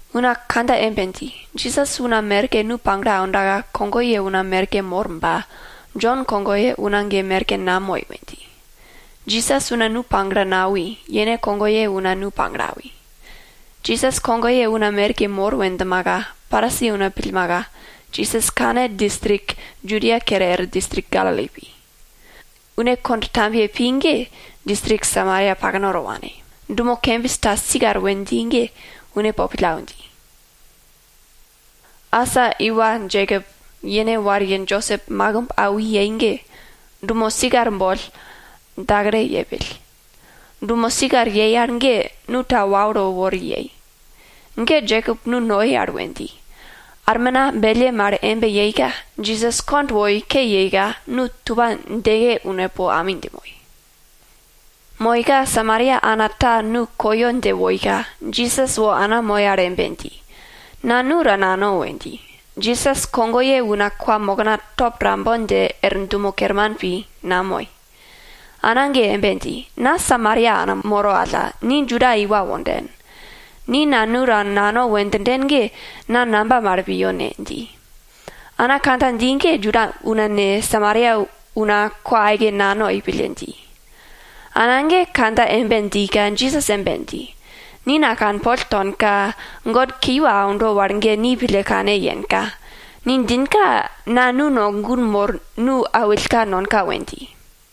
Una kandja embe dji, Jisas una merke nu pagle aundaka, kogoye una merke mor ba, Jon kogoye una ge merke namoi we dji. Jisas una nu pagle nawi, yene kogoye una nu pagle awi. Jisas kogoye una merke mor we djimaka, Parisi una pillmaka, Jisas kane distrik Judia kere er distrik Galili pi. Une kond tambiye pi ge distrik Samaria paknato wane, dumo kembis ta Sikar we dji ge une po pillau dji. Asa iwa Jekop yene wariye Josep makimb awi yei ge, dumo Sikar boll dakalo yepill. Dumo Sikar yei al ge, nu ta waulo wori yei. Ge Jekop nu noi al we dji. Armina belle mal embe yeika, Jisas kond woi ke yeika, nu tupa djeke une po ami dje moi. Moika Samaria ana ta nu koyo dje woika, Jisas wo ana moi al embe dji, na nu ta nano we dji. Jisas kogoye una kwamokna top tambon dje er dumo kerman pi, namoi. Ana ge embe dji, na Samaria ana moro alla, ni Juda iwa wonden. Ni na nu ta nano we djinden ge na namba mal piyo ne? dji. Ana kandja dji ge Juda una ne, Samaria una kwa aike nanoi pille dji. Ana ge kandja embe djika Jisas embe dji, ni na kanpol tonka, God kiwa aundo wal ge ni pille kane yenka, ni djinka na nu no gun mor nu awillka nonka we dji.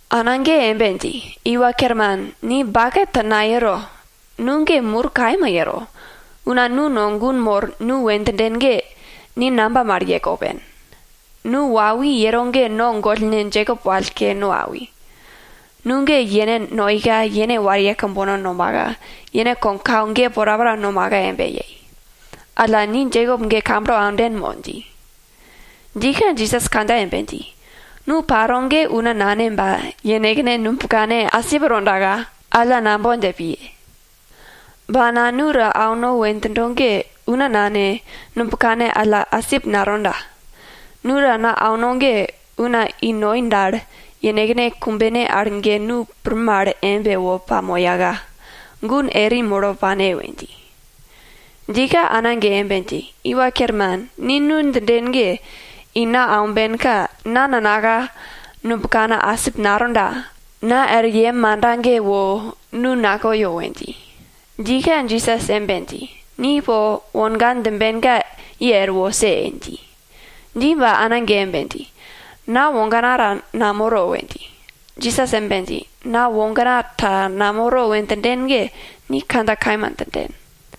Ana ge embe dji, iwa kerman, ni baket ta nayero, nu ge mur kaima yero. Una nu no gun mor nu we djinden ge, ni namba mal ye kopen? Nu wawi yero ge no gollne Jekop wallko no awi. Nu ge yene noika, yene wariye kambono nomaka, yene kogyekau ge porapora nomaka embe yei. Alla, ni Jekop ge kamblo aunden mo? dji. Djika Jisas kandja embe dji, nu paro ge una nane ba, yenekne nubkane asip tondaka alla nambon dje piye. Ba na nu ta auno we djindo ge, una nane, nubkane alla asip natonda. Nu ta na auno ge, una i noi dal, yenekne kumbene al ge nu pir mal embe wo pamoyaka, gun eri molo pane we dji. Djika ana ge embe dji, iwa kerman, ni nu djinden ge, i na aumbenka, na nanaka nubkana asip natonda, na er yem manda ge wo nu nakoyo we dji. Djika Jisas embe dji, ni po wogan djimbenka ye er wose! dji. Dji ba ana ge embe dji, na wogana ta namoro we dji. Jisas embe dji, na wogana ta namoro we djinden ge, ni kandja kaima djinden.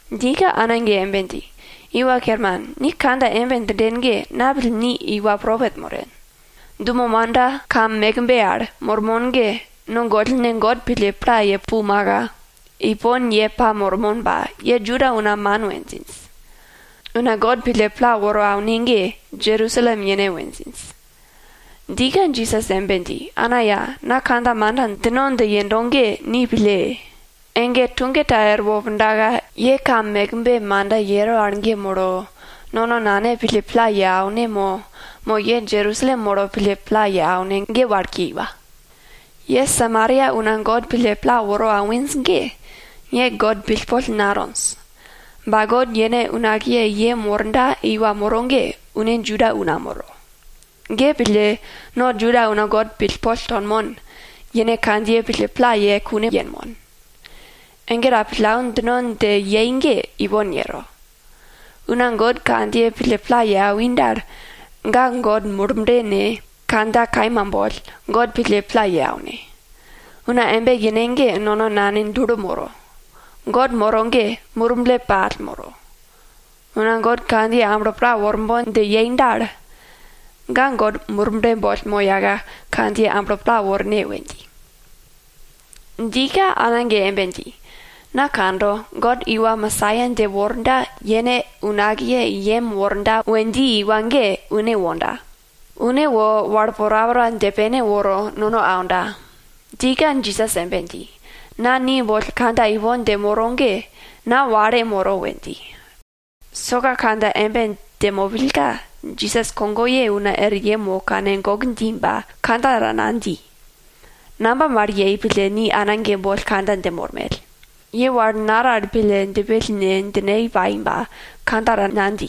Djika ana ge embe dji, iwa kerman, ni kandja embe djinden ge, na pill ni iwa propet moren. Dumo manda kam mekbe al mormon ge, no gollne God pille pla ye pumaka, ipon ye pamormon ba, ye Juda una man we djinj. Una God pille pla woro aune ge Jerusalem yene we djinj. Djika Jisas embe dji, ana ya, na kandja manda djino dje yendo ge ni pille! Ege tuge ta erwo pundaka, ye kam mekbe manda yero al ge molo, nono Nane pille pla ye aune mo, mo ye Jerusalem molo pille pla ye aune ge wal kiwa. Ye Samaria una God pille pla woro awinj ge, ye God pillpol natonj. Ba God yene unakiye i yem worda iwa moro ge, une Juda una moro. Ge pille, no Juda una God pillpol tonmon, yene kandjiye pille pla ye kune yenmon. Ege ta pillau djino dje yei ge ipon yero. Una God kandjiye pille pla ye awi dal, ga God Murble ne, kandja kaima boll, God pille pla ye aune. Una embe yene ge nono Nane dulo moro. God moro ge Murble pall moro. Una God kandjiye amblo pla worbon dje yei dal, ga God Murble boll moyaka, kandjiye amblo pla worne we dji. Djika ana ge embe dji, na kando, God iwa Mesaia dje worda, yene unakiye i yem worda we dji iwa ge, une wonda. Une wo wal porapora dje pene woro nono aunda. Djika Jisas embe dji, na ni boll kandja ipon dje moro ge, na wale moro we dji. Soka kandja embe dje mopillka, Jisas kogoye una er yem wo kane gok dji ba, kandja ta nadji. Namba mal yei pille ni ana ge boll kandja dje mormell? Ye wal naral pille djipill ne djine pai ba kandja ta nadji.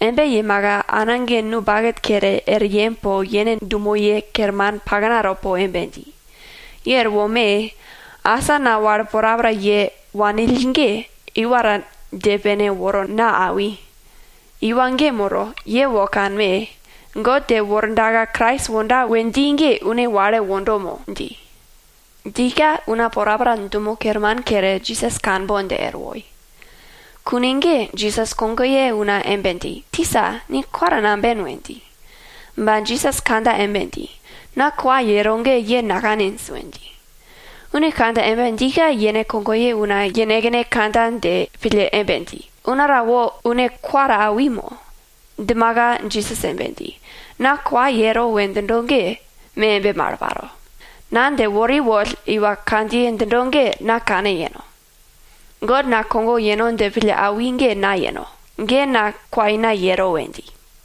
Embe yemaka ana ge nu baket kere, er yem po yene dumoye kerman paknato po embe dji, ye er wome! Asa na wal porapora ye wanill ge, iwa ta dje pene woro na awi. Iwa ge moro, ye wo kanme! God dje wordaka Krais wonda we dji ge une wale wondo mo? dji. Djika una porapora dumo kerman kere, Jisas kanbon dje er woi. Kune ge Jisas kogoye una embe dji, tisa, ni kwa ta namben we dji. Ba Jisas kandja embe dji, na kwa yero ge ye nakaninj we dji. Une kandja embe djika, yene kogoye una yenekne kandja dje pille embe dji, una ta wo une kwa ta awi mo? Djimaka Jisas embe dji, na kwa yero we djindo ge, me embe mal paro. Na dje wori woll iwa kandjiye djindo ge na kane yeno. God na kogo yeno dje pille awi ge na yeno. Ge, na kwaina yero we dji.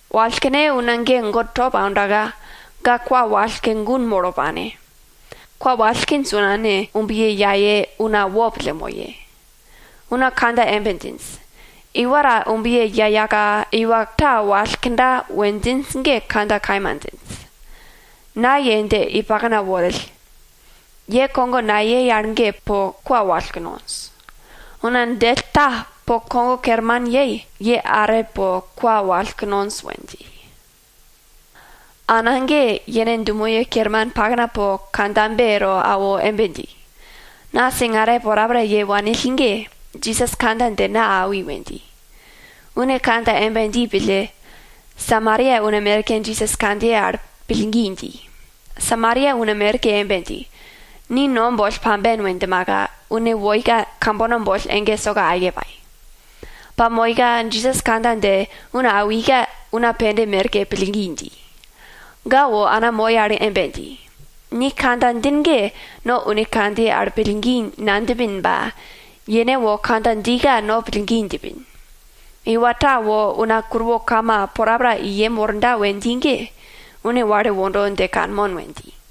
Wallkne una ge God top aundaka, ga kwa wallko, gun molo pane. Kwa wallkinj una ne, umbiye yaye una wopille moye. Una kandja embe djinj, iwa ta umbiye yayaka, iwa ta wallkda we djinj ge kandja kaima djinj. Na ye dje i pakna worill, ye kogo nayei al ge po kwa wallko nonj. Una djell ta po kogo kerman yei, ye are po kwa wallko nonj we dji. Ana ge, yene dumoye kerman pakna po kandjabe to una awo embe dji, na singare porapora ye wanill mal ge, Jisas kandja dje na awi we dji. Une kandja embe dji pille, Samaria una merke Jisas kandjiye al pillgi dji. Samaria una merke embe dji, ni no boll pamben we djimaka, une woika kambono boll ege soka aike pai. Pa molmaka Jisas kandja dje una awika una pende merke pillgi dji. Ga wo ana moi al embe dji, ni kandja djin ge no une kandjiye al pillgi nadjipin ba, yene wo kandja djika no pillgi djipin. Iwa ta wo una kuruwo kama porapora i yem worda we dji ge, une wale wondo dje kanmon we dji.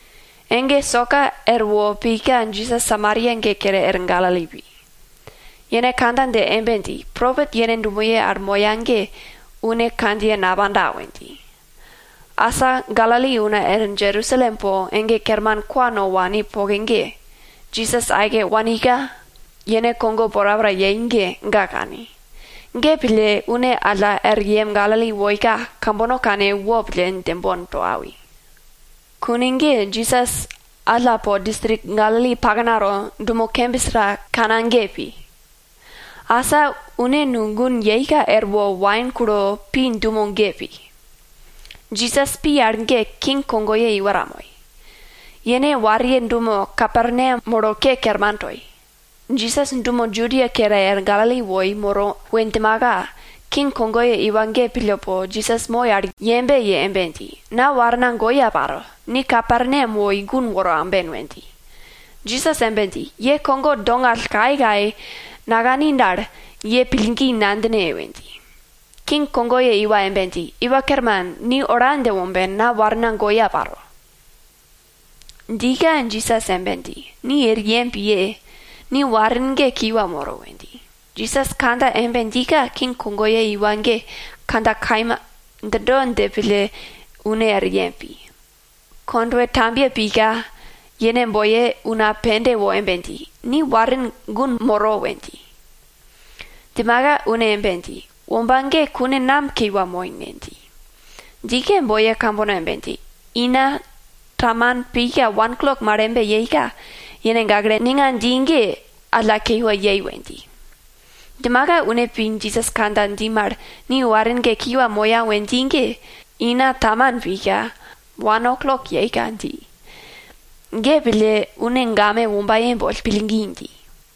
Ege soka erwo pika Jisas Samaria ge kere er Galili pi. Yene kandja dje embe dji, propet yene dumoye al moya ge une kandjiye napanda we dji. Asa Galili una er Jerusalem po ege kerman kwa no wani poke ge, Jisas aike wanika, yene kogo porapora yei ge, ga kani. Ge pille, une alla er yem Galili woika, kambono kane wopille djembon to awi. Kune ge Jisas alla po distrik Galili paknato dumo kembis ta Kana ge pi. Asa une nu gun yeika erwo wain kulo pi dumo ge pi. Jisas pi al ge king kogoye iwa ta moi. Yene wariye dumo Kaperneam molo ke kerman toi. Jisas dumo Judia kere er Galili woi moro we djimaka, king kogoye iwa ge pille po Jisas moi al yembe ye embe dji, na warna goya paro, ni Kaperneam wo i gun woro aumben we dji. Jisas embe dji, ye kogo dongall kayekaye nakani dal, ye pillgi nadjine we dji. King kogoye iwa embe dji, Iwa Kerman, ni ola dje womben, na warna goya paro. Djika Jisas embe dji, ni er yem piye! Ni warin ge kiwa moro we dji. Jisas kandja embe djika king kogoye iwa ge kandja kaima djindo dje pille une er yem pi. Kondwe tambiye pika, yene boiye una pende wo embe dji, ni warin gun moro we dji. Djimaka une embe dji, womba ge kune nam kiwa moi ne? dji. Djika boiye kambono embe dji, ina taman pika wan oklok mal embe yeika, yene gakle ninga dji ge alla kiwa yei we dji. Djimaka une pi Jisas kandja dji mal, ni warin ge kiwa moya we dji ge, ina taman pika wan oklok yeika dji. Ge pille, une game wombaye boll, pillgi dji.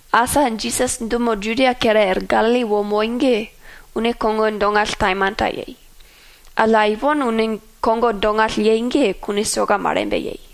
Asa Jisas dumo Judia kere er Galili wo moi ge, une kogo dongall taimanta yei. Alla ipon une kogo dongall yei ge, kune soka mal embe yei.